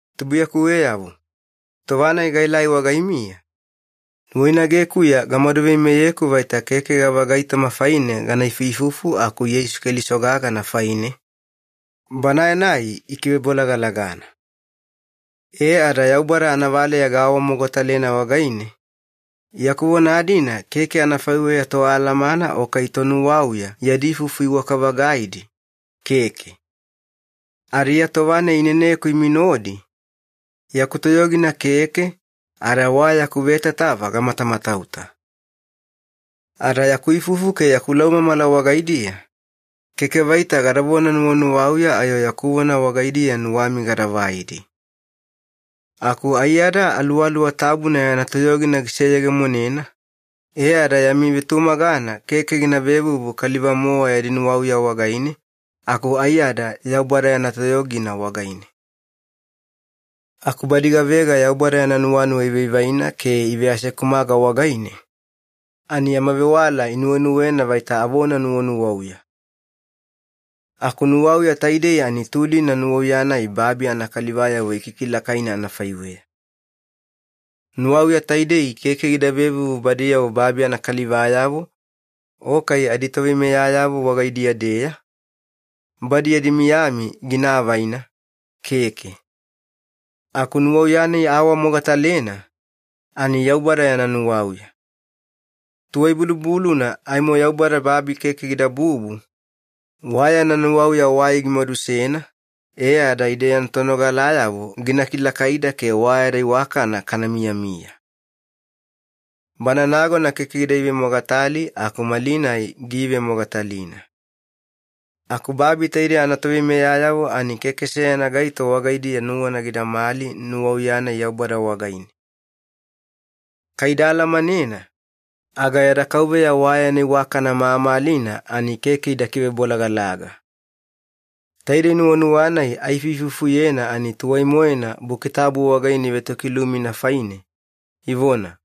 Tubuiyakuweyavo, tova-nai gaelai wagaimiya, nuwainagekuya gamadu veimeyeku vaita keke gavagaitoma faine gana ifuifufu aku Yeisu Keliso gagana faine, Banae-nai ikivebolagalagana. E ada Yaubada anavaleya gaawamogatalena wagaine, yaku vona-dina keke anafaiweya toalamana o kai tonuwauya yadi ifufu iwaka-vagaidi, keke. Ada Iya tova-nai ineneku imi nodi, yaku toyogina keke, ada wa yaku vetatava gamatamatauta. Ada yaku ifufu ke yaku laumamala wagaidiya, keke vaita gadavona nuwanuwauya ayo yaku vona wagaidiya nuwami gada vaidi. Aku aiyada Aluwaluwa Tabuna yana toyogina giseyegemonena, e ada yami vetumagana keke gina vevuvu kaliva-mowa yadi nuwauya wagaine, aku aiyada Yaubada yana toyogina wagaine. Aku badi gavega Yaubada yana nuwanuwa ivaivaina ke iveasekumaga wagaine, ani yama vewala inuwenuwena vaita avona nuwanuwauya. Aku nuwauya taidei ani tulina nuwauya-nai babi anakalivayavo ikikilakaina anafaiweya. Nuwauya taidei keke gida vevuvu badiyavo babi anakalivayavo o kai aditoveimeyayavo wagaidiya-deya, badi yadi miyami gina avaina, keke. Aku nuwauya-nai aawamogatalena ani Yaubada yana nuwauya. Tuwai-bulubuluna aimo Yaubada babi keke gidabubu, wa yana nuwauya wai gimadusena e ada ide yana tonogalayavo gina kilakaida ke wa yada iwakana kana miyamiya. Bana nagona keke gida ivemogatali, aku malinai giivemogatalina. Aku babi taide anatoveimeyayavo, ani keke seyana gaito wagaidiya nuwana gidamali nuwauya-nai Yaubada wagaine. Kai ida alamanena, aga yada Kauveya wa yana iwakana mamalina ani keke ida kivebolagalaga. Taidei nuwanuwa-nai aifuifufuyena, ani tuwai-moena Buki Tabu wagaine ivetokilumina faine, ivona,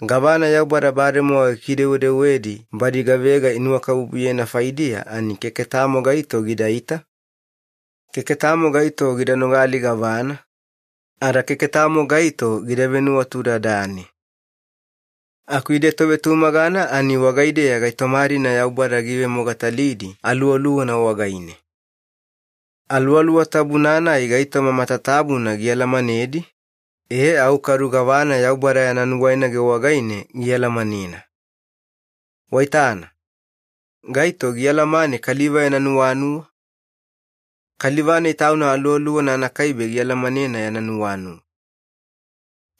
“Gavana Yaubada bademowa gikidewedewedi badi gavega inuwakabubuyena faidiya, ani keke tamo gaito gidaita, keke tamo gaito gida nogali gavana, ada keke tamo gaito gida venuwatudadane.” Aku ide tovetumagana, ani wagaideya gaitoma-dina Yaubada giivemogatalidi Aluwaluwana wagaine. Aluwaluwa Tabuna-nai gaitoma matatabuna gialamanedi, e au kadu gavana Yaubada yana nuwainage wagaine gialamanena. Waitana, gaito gialamane kaliva yana nuwanuwa? Kaliva-nai tauna aluwaluwana anakaibe gialamanena yana nuwanuwa.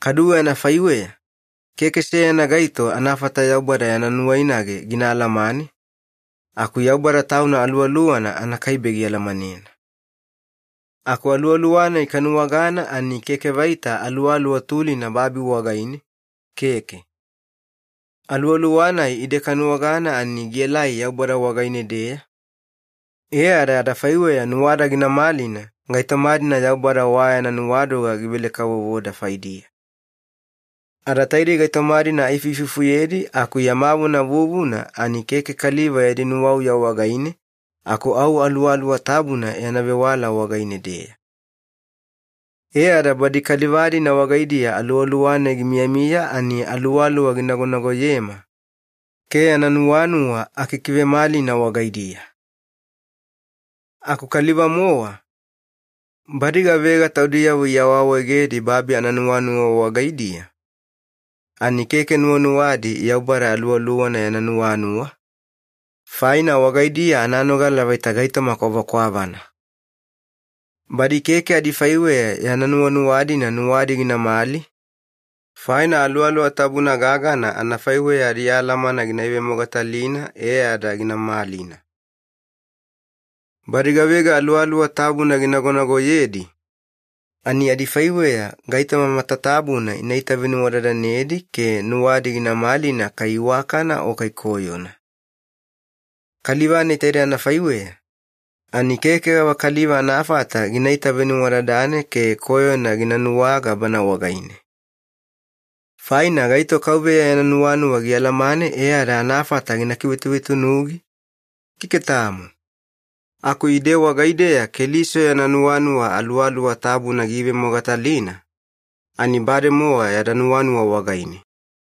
Kaduwe anafaiweya, keke seyana gaito anafata Yaubada yana nuwainage gina alamane, aku Yaubada Tauna Aluwaluwana anakaibe gialamanena. Aku Aluwaluwa-nai kanuwagana ani keke vaita aluwaluwa tulina babi wagaine, keke. Aluwaluwa-nai ide kanuwagana ani gielai Yaubada wagaine-deya, e ada adafaiweya nuwada gina malina gaitoma-dina Yaubada wa yana nuwadoga givele-kavovoda faidiya. Ada taidei gaitoma-dina aifuifufuyedi, aku yama vona vuvuna ani keke kaliva yadi nuwauya wagaine, aku au Aluwaluwa Tabuna yana vewala wagaine-deya. E ada badi kaliva-dina wagaidiya Aluwaluwa-nai gimiyamiya, ani Aluwaluwa ginagonagoyema ke yana nuwanuwa akikivemalina wagaidiya. Aku kaliva-mowa, badi gavega taudiyavo iawaawaegedi babi ananuwanuwa wagaidiya, ani keke nuwanuwadi Yaubada Aluwaluwana yana nuwanuwa, faina wagaidiya ananogala vaita gaitoma kwavakwavana. Badi keke adifaiweya yana nuwanuwa-dina nuwadi ginamali, faina Aluwaluwa Tabuna gagana anafaiweya adialamana gina ivemogatalina e ada gina malina. Badi gavega Aluwaluwa Tabuna ginagonagoyedi, ani adifaiweya gaitoma matatabuna ina itavenuwadadanedi ke nuwadi gina malina kai iwakana o kai koyona. Kaliva-nai taide anafaiweya, ani keke gavakaliva anafata gina itavenuwadadane ke koyona gina nuwaga bana wagaine. “Faina gaito KAUVEYA yana nuwanuwa gialamane e ada anafata gina kivetuvetunugi? Keke tamo.” Aku ide wagaideya Keliso yana nuwanuwa Aluwaluwa Tabuna giivemogatalina, ani bademowa yada nuwanuwa wagaine.